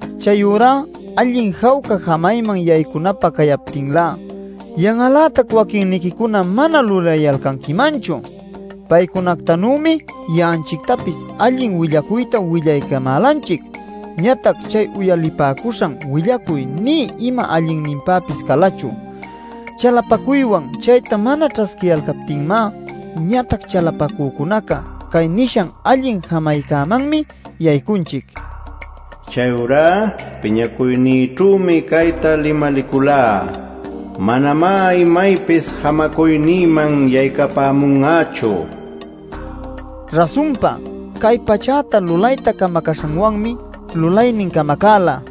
Chayurá allin jawca jamayman yaycunapä cayaptinlá, yan'al-lätac waquinniquicuna mana lulayalcanquimanchu. Paycunactanümi ya'anchictapis allin willacuyta willaycamälanchic. Ñatac chay uyalipäcuśhan willacuy nï ima allinninpäpis calachu, chalapacuywan chayta mana ćhasquiyalcaptinmá. Ñatac chalapacücunacá cay nishan allin jamaycämanmi yaycunchic: “Chayurá, piñacuynïćhümi cayta limaliculá: ‘Manamá imaypis jamacuynïman yaycapämun'achu’” nil nishancäman. Rasunpa, cay pachäta lulayta camacäśhanwanmi lulaynin camacäla.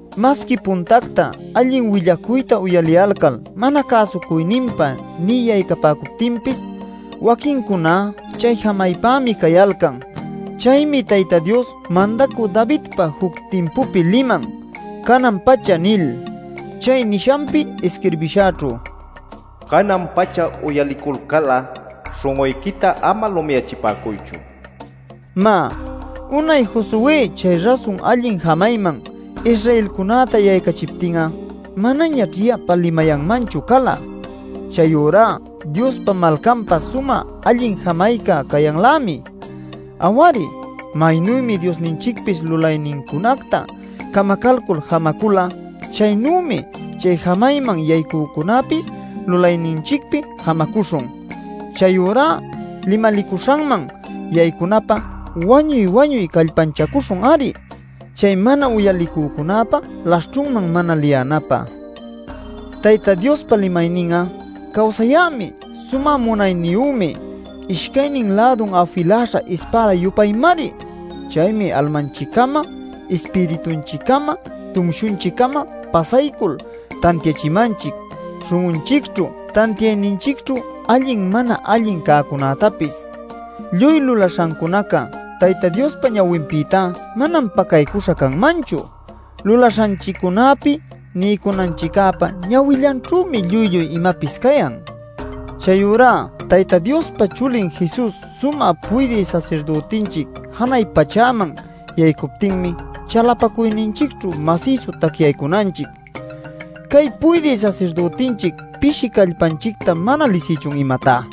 Masqui puntacta allin willacuyta uyaliyalcal mana cäsucuyninpa nï yaycapäcuptinpis waquincuná chay jamaypämi cayalcan. Chaymi Tayta Dios Mandacü Davidpa juc timpupi liman “canan-pacha” nil. Chay nishanpi isquirbishaćhu: “Canan-pacha, uyaliculcal'a śhun'uyquita ama lumiyachipäcuychu” nila. Má, unay Josué chay rasun allin jamayman Israelcunäta yaycachiptin'a manañaćh yapa limayanmanchu cala. Chayurá Diospa malcanpä sumä allin jamayca cayanlämi. Aw-ari, maynümi Diosninchicpis lulaynincunacta camacalcul jamacula, chaynümi chay jamayman yaycücunäpis lulayninchicpi jamacuśhun. Chayurá limalicuśhanman yaycunapä wañuy-wañuy callpanchacuśhun-ari chay mana uyalicücunäpa laśhćhunman mana liyänapä. Tayta Diospa limaynin'a cawsäyämi sumä munayniyümi ishcaynin lädun afiläśha ispäda-yupaymari. Chaymi almanchiccama ispiritunchiccama, tumshunchiccama pasaycul tantiachimanchic śhun'unchicćhu tantiayninchicćhu allin mana allin cäcunätapis. Lluy lulaśhancunaca Tayta Diospa ñawinpïta manam pacaycuśha canmanchu. Lulaśhanchiccunäpi niycunanchiccäpa ñawillanćhümi lluy lluy imapis cayan. Chayurá Tayta Diospa Chulin Jesus sumä puydï sasirdütinchic janay pachäman yaycuptinmi chalapacuyninchicćhu masïsu tacyaycunanchic. ¿Cay puydï sasirdütinchic pishi callpanchicta mana lisïchun, imatá?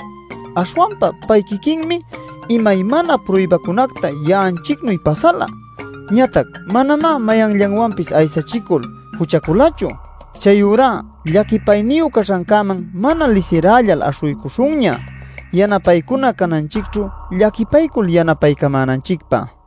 Aśhwanpa pay quiquinmi imaymana pruybacunacta ya'anchicnuy pasala, ñatac manamá mayanllanwanpis aysachicul juchaculachu. Chayurá llaquipayniyu caśhancäman mana lisirällal aśhuycuśhunña yanapaycuna cananchicćhu llaquipaycul yanapaycamänanchicpä.